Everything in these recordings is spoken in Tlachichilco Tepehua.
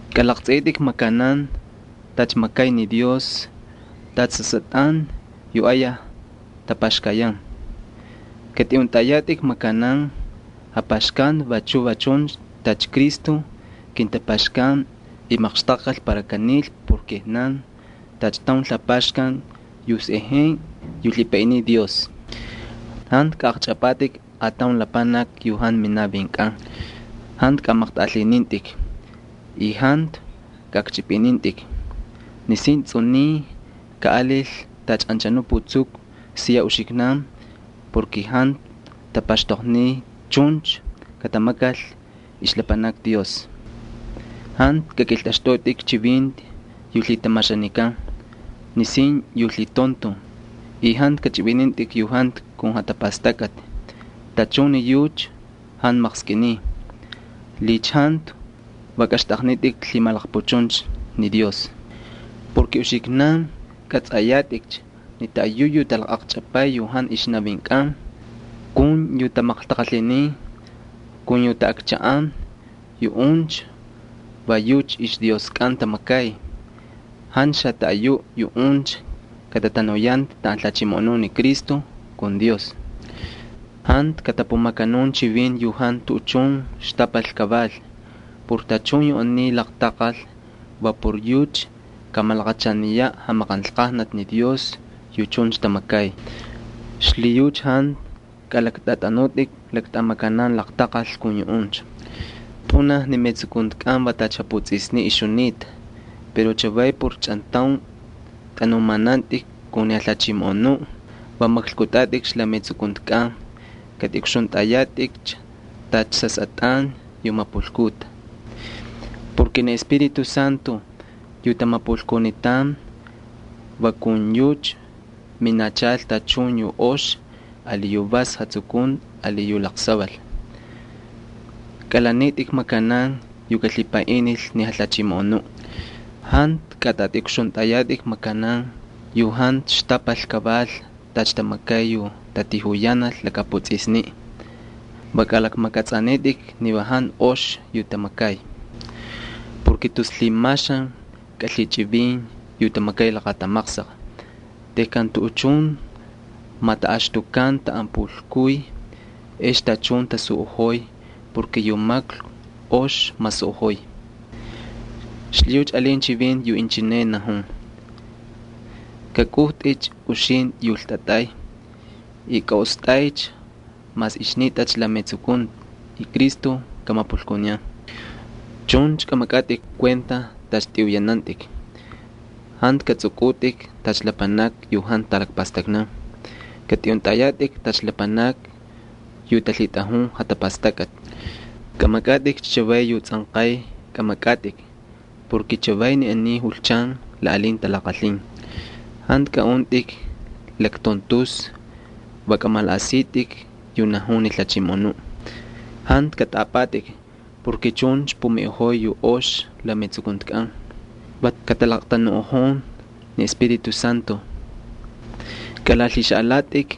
Kalaqtsꞌiꞌitꞌik makanan tacha makay ni Dios, tacha sasꞌatꞌan yu ayaj tapaxkayan. Katꞌiꞌuntꞌayatꞌik makanan japaxkanti vachu va chuncha tacha Cristo kintapaxkan y maqxtaqkal para kanil por kijnankꞌan tacha taun lapaxkan yu sꞌejenꞌe yu lhipaꞌiniy Dios. Jantu katꞌatꞌamatꞌik lapanakni yu jantu minavinkꞌan kataval, jantu kamaqtꞌaꞌalhinintꞌik, y jantu kaꞌakchꞌipꞌinintꞌik. Nisin tsꞌuniy kaꞌalil tacha anchanuꞌ putsuku siya uxiknan porke jantu tapaxtoqniy chuncha katamakal ixlapanakni Dios. Jantu kakꞌiltꞌaxtꞌutꞌik chivinti yu lhitamaxanikan nisin yu lhitontoj y jantu kꞌachꞌivinintꞌik yu jantu kun jatapastakꞌati. Tachun ni yucha jantu maqskꞌiniy. Va kaxtꞌaqnitꞌik lhimalaqpuchuncha ni Dios. Uxiknan kꞌatsꞌayatꞌikcha ni taꞌayuꞌ yu tatꞌatamay yu jantu ixnavinkꞌan kaval y yu tamaqtaqalhinin y yu taꞌakchaꞌan, yuꞌuncha va yucha ixdioskꞌan tamakay. Jantu xataꞌayuꞌ yuꞌuncha katatanuyanta taꞌan jalhachimoꞌonun ni Cristo kun Dios. Jantu katapumakanun chivinti yu jantu tuꞌuchun xtapal kaval. Por tachun yu aniy laqtaqal va por yucha kamalaqachaniyaꞌ jamaqanlqajnati ni Dios yu chuncha tamakay. Xlhiyucha jantu kꞌalaktꞌatꞌanutꞌik makanan laqtaqal kun yuꞌuncha. Pꞌunaj ni metsukuntikꞌan va tacha japutsꞌisniꞌ ixjunita. Pero chavaycha por chꞌantaun tꞌanumanantꞌik kun ni Jalhachimoꞌonuꞌ va maklkꞌutꞌatꞌikcha la metsukuntikꞌan. Katꞌiꞌukxuntꞌayatꞌik tacha sasꞌatꞌan yu mapulkuta. Ni Espíritu Santo yu tamapulkunitan va kun yucha minachal tachun yu ox ali yu vas jatsukunti ali yu laqsaval. Kꞌalanitꞌik makanan yu kalhipaꞌinil ni Jalhachimoꞌonuꞌ. Jantu katꞌatꞌiꞌukxuntꞌayatꞌik makanan yu jantu xtapal kaval tacha tamakay yu tatijuyanal laka putsꞌisni. Va kꞌalakmakꞌatsꞌanitꞌik ni va jantu ox yu tamakay. Va tus lhimaxan kꞌalhichꞌivin yu tamakay laqatamaqsaq. Tejkan tuꞌuchun mataꞌaxtukan taꞌan pulkuy ex tachun tasuꞌojoy, yu maklku ox masuꞌojoy. Xlhiyucha alin chivinti yu inchineꞌ najun: “Kꞌakꞌujtꞌicha uxintꞌi yu ltꞌatꞌay y kaꞌostꞌaycha mas ixnitꞌacha la metsukunti y Cristo kamapulkuniyan.” Chuncha kꞌamakꞌatꞌik kuenta tacha tꞌiꞌuyanantꞌik. Jantu katsꞌukꞌutꞌik tacha lapanakni yu jantu talakpastaknan. Katꞌiꞌuntꞌayatꞌik tacha lapanakni yu talhitꞌajun jatapastakꞌati. Kꞌamakꞌatꞌikcha chavay yu tsꞌanqay kꞌamakꞌatꞌik porke chavay ni aniy julchan la alin talaqalhin. Jantu kꞌaꞌuntꞌik laktontusna, va kꞌamalaꞌasitꞌik yu najun ni Jalhachimoꞌonuꞌ. Jantu katꞌaꞌapꞌatꞌik porke chuncha pumiꞌojoy yu ox la metsukuntikꞌan, va katalaqtanuꞌojon ni Espíritu Santo. Kꞌalalhixaꞌalatꞌik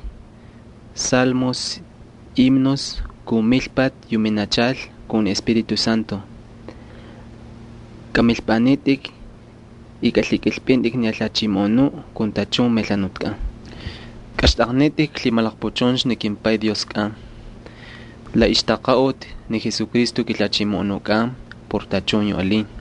salmos, himnos, kun milpati yu minachal kun ni Espíritu Santo. Kꞌamilpꞌanitꞌik y kꞌalhikꞌilpꞌintꞌik ni Jalhachimoꞌonuꞌ kun tachun melhanutkꞌan. Kaxtꞌaqnitꞌik lhimalaqpuchuncha ni kimPay Dioskꞌan la ixtaqaꞌuti ni Jesucristo kiJalhachimoꞌonukꞌan por tachun yu alin.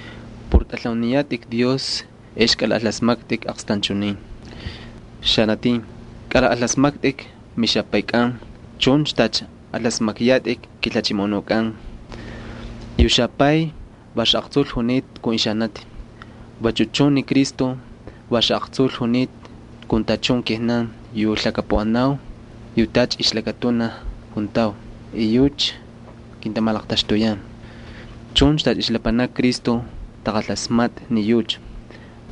Por tꞌalhauniyatꞌik ni Dios ex kꞌalaꞌalasmaktꞌik aqstanchunin. Xanatin, kꞌalajꞌalasmaktꞌik mixapaykꞌan chuncha tacha alasmakyatꞌik kiJalhachimoꞌonukꞌan Jesucristo. Yu xapay va xaꞌaqtsul junita kun ixanati. Vachu chun ni Cristo va xaꞌaqtsul junita kun tachun kijnan yu lhakapuꞌanau yu tacha ixlakatunaj juntau y yucha kintamalaqtaxtuyan. Chuncha tacha ixlapanakni Cristo taqalasmatꞌa ni yucha,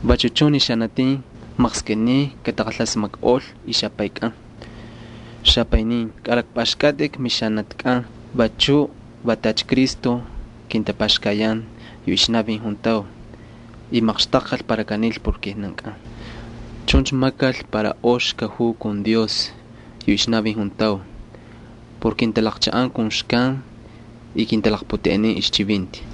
vachu chun ni xanatin maqskꞌiniy kataqalasmakꞌol ixapaykꞌan. Xapaynin, kꞌalakpꞌaxkꞌatꞌik mixanatikꞌan vachu va tacha Cristo kintapaxkayan yu ixnavin juntau y maqxtaqkal para kanil por kijnankꞌan. Chuncha makal para ox kajuu kun Dios yu ixnavin juntau por kintalaqchaꞌan kun xkan y kintalaqputeꞌenin ixchivinti.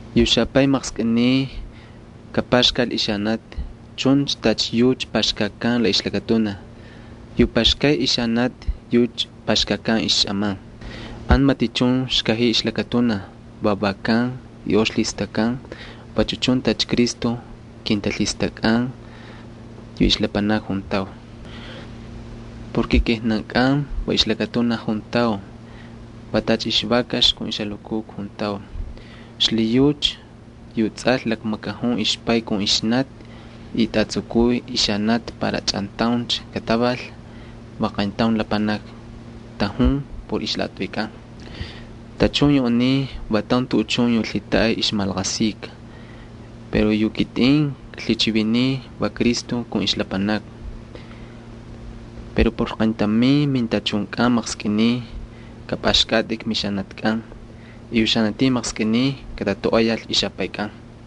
Yu xapay maqskꞌiniy kapaxkal ixanati chuncha tacha yucha paxkakan la ixlakatunaj. Yu paxkay ixanati yucha paxkakan xꞌaman. Jantu matichun xkajiy ixlakatunaj. Vavakan y ox lhistakkan vachu chun tacha Cristo kintalhistakꞌan yu ixlapanakni juntau. Ni kijnankꞌan va ixlakatunaj juntau, va tacha ixvakax kun ixjalukukna juntau. Xlhiyucha yu tsꞌal lakmakajun ixpay kun ixnati y tꞌatsukuy ixanati para chꞌantauncha kataval. Va qayntaun lapanaki tajun por ixlaꞌatꞌuykꞌan. Tachun yu aniy va taun tuꞌuchun yu lhitaꞌay ixmalaqasika, pero yu kitꞌin klhichiviniy va Cristo kun ixlapanakni. Pero por qayntamin mintachunkꞌan maqskꞌiniy kapꞌaxkꞌatꞌik mixanatikꞌan y yu xanatin maqskꞌiniy katatoꞌoyal ixapaykꞌan.